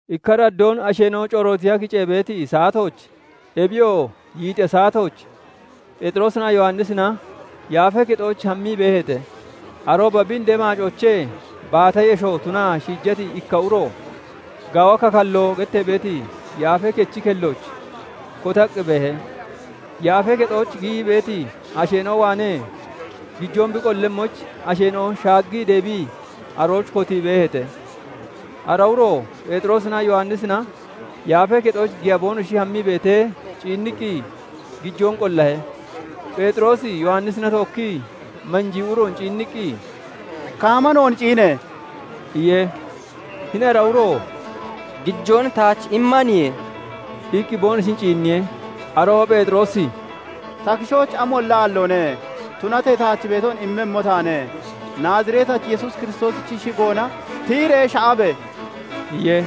Ikka araddoon asheena'o corootiya kicee beeti saatooch, ebiyoo yiixiya saatooch, Pheexiroosinaa Yowannisina Yaafee Kexooch hammii beeheete. Arooba bi indee maacoochee baata yesho tunaa shiijati ikka uro "Gaawa Kakalloo" gettee beeti Yaafee Kechi kellooch kotaqqi beehe. Yaafee Kexooch giyii beeti asheena'o waanee gijoon bi qollemmoyich, asheena'o shaaggii deebii arooch kotii beeheete. Ara uro Pheexiroosinaa Yowannisina Yaafee Kexooch giya boonoshi hammii beetee ciinniqqi, gijoon qollahe. Pheexiroosi Yowannisina tookkii manjii uroon ciinniqqi, "Kaama noon ciine!" iye. Hini ara uro "Gijoon taach immaniye" iqqi boonoshin ciinniye. Arooba Pheexiroosi "Ta kishooch amolla aalloone; tunatee taach beeton immemmo taane. Naaziretachi Yesuus Kiristoosichi shigoona tiyiree sha'abe!" iye.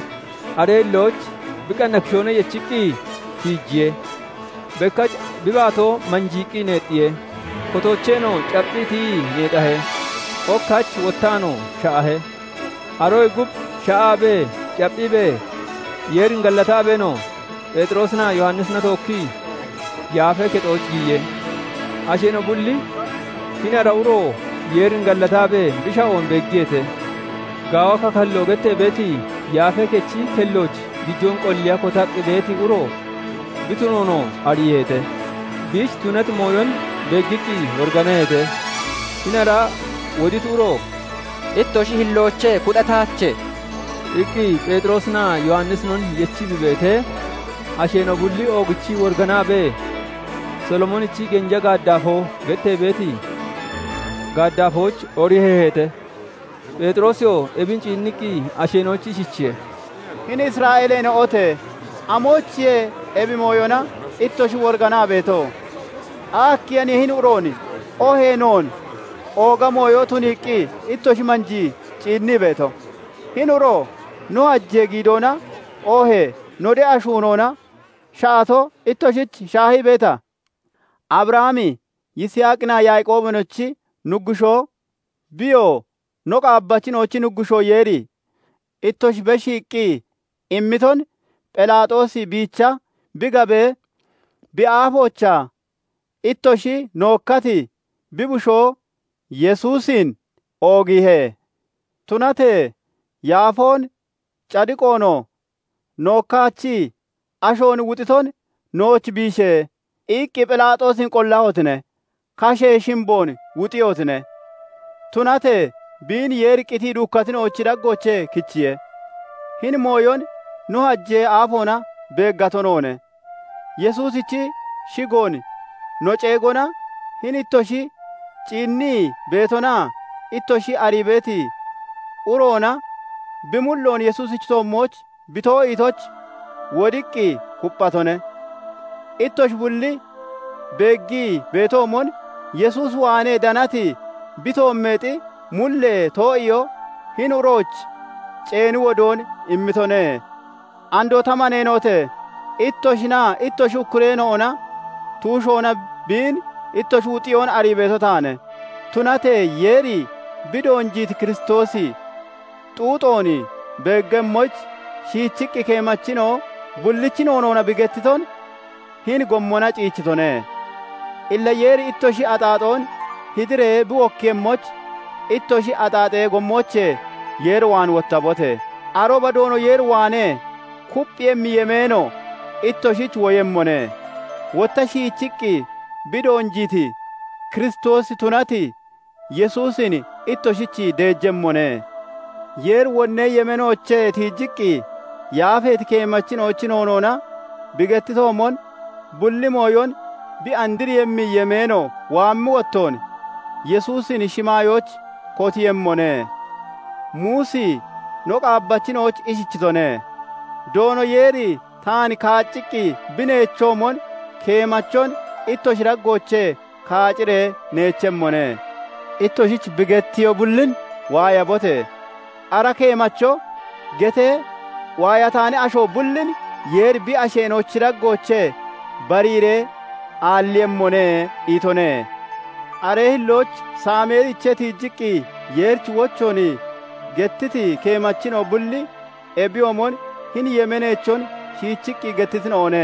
Aree hillooch bi qanna kishoona yechiqqi tiijiye. Bekkach bi baatoo manjiiqqi neexxiye; kotoocheenoo capphiqqi tiyii neexahe; ok hach wottaanoo sha'ahe. Aroyee gub sha'aabee, capphiibee, Yeerin gallataabeenoo, Pheexiroosinaa Yowannisina tookkii Yaafee Kexooch giyiye. Asheena'o bulli hini ara uro Yeerin gallataabee bi sha'oon beeggiyeete. "Gaawa Kakalloo" gettee beeti Yaafee Kechi kellooch gijoon qolliya kotaqqi beeti uro bi tunoonoo ariiheete. Biich tunati mooyon beeggiqqi woriganaheete. Hini ara woditi uro "Ittoshi hilloochee kuxataache" iqqi Pheexiroosinaa Yowannisinon yechii bi beetee, asheena'o bulli oogichii woriganaabee, "Solomoonichi genja gaaddaafoo" gettee beeti gaaddaafooch oriheeheete. Pheexiroosiyoo ebin ciinniqqi asheena'oyich ishichiye:- "Hini Isra'eeleena'ote! Amoyichiye ebi mooyona ittoshi woriganaa beeto? Akkiyaniye hini uroon oohee noon ooga mooyo tuniiqqi ittoshi manjii ciinnii beeto? Hini uro no hajee giidoona oohee no de'a shuunoona sha'ato ittoshich shaahii beeta? Abrahami, Yiisaaqinaa Yaaqoobinochi Nuggushoo, Biyoo no qaabbachina'ochi Nuggushoo Yeeri, ittoshi beshiiqqi immiton Phelaaxoosi biicha bi gabee, bi aafoochaa ittoshi nookkati bi Bushoo Yesuusin oogiihe. Tunatee yaafoon, cadiqoonoo nookkaachii, ashoon wuxiton 'Nooch biishe!' iqqi Phelaaxoosin qollahotine; Kashee Shimboon wuxiihotine. Tunatee biin Yeeri qitii duukkatina'ochi daggoochee kichiye. Hini mooyon no hajee aafoona beeggato noone. Yesuusichi shigoon no ceegona hini ittoshi ciinnii beetonaa ittoshi arii beeti uroona bi mulloon Yesuusichi toommooch bi too'iitoyich, wodiqqi kupphatone. Ittoshi bulli beeggii beetoomon, Yesuus waanee danati bi toommeexi mullee too'iyoo hini uroyich ceeni wodoon immitone. "Andoo ta maneena'ote! Ittoshinaa ittoshi ukkureena'ona tuushoona biin ittoshi wuxiyoon arii beeto taane. Tunatee Yeeri bi doonjiiti Kiristoosi xuuxoon beeggemmoyich, shiichiqqi keemachina'o bullichi noonoona bi gettiton hini gommona ceechitone. Illa Yeeri ittoshi axaaxoon hidiree bi wokkiiyemmoyich, ittoshi axaaxee gommoochee Yeer waan wottabote! Arooba Doono Yeer waanee kupphiiyemmi yemeeno ittoshich woyemmone; wotta shiichiqqi bi doonjiiti Kiristoosi tunati Yesuusin ittoshich deejemmone. Yeeri wonnee yemeenoochee tiijiqqi yaafeeti keemachina'ochi noonoona bi gettitoomon, bulli mooyon bi andriiyemmi yemeeno waammi wottoon Yesuusin shimaayooch kotiiyemmone. Muusi no qaabbachina'oyich ishichitone:- 'Doono Yeeri taan kaacciqqi bi neechoomon, keemachon ittoshi daggoochee kaaciree neechemmone; ittoshich bi gettiyo bullin waayabote! Ara keemacho getee waayataani asho bullin Yeeri bi asheena'ochi daggoochee bariiree aalliiyemmone' itone. "Aree hillooch Saameeliichee tiijiqqi Yeerichi wochoon gettiti keemachina'o bulli ebiyoomon hini yemeeneechon shiichiqqi gettitina'one.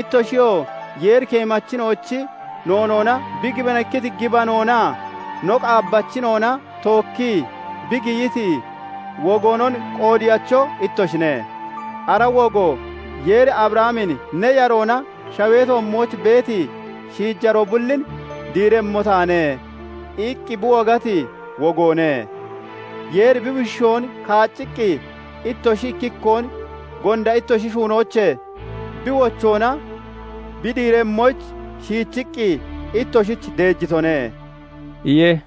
ittoshiyoo Yeeri keemachina'ochi noonoona bi gibanikkiti gibanoonaa no qaabbachina'ona tookkii bi giyiti wogoonon qoodeyacho ittoshine; ara wogo Yeeri Abrahamin 'Ne yaroona shawee toommooch beeti shiijaroo bullin diiremmo taane' iqqi bi wogati wogoone. Yeeri bi bushoon kaacciqqi, ittoshi ikkikkoon gonda ittoshi shuunoochee bi wochoona bi diiremmoyich, shiichiqqi ittoshich deejitone" iye.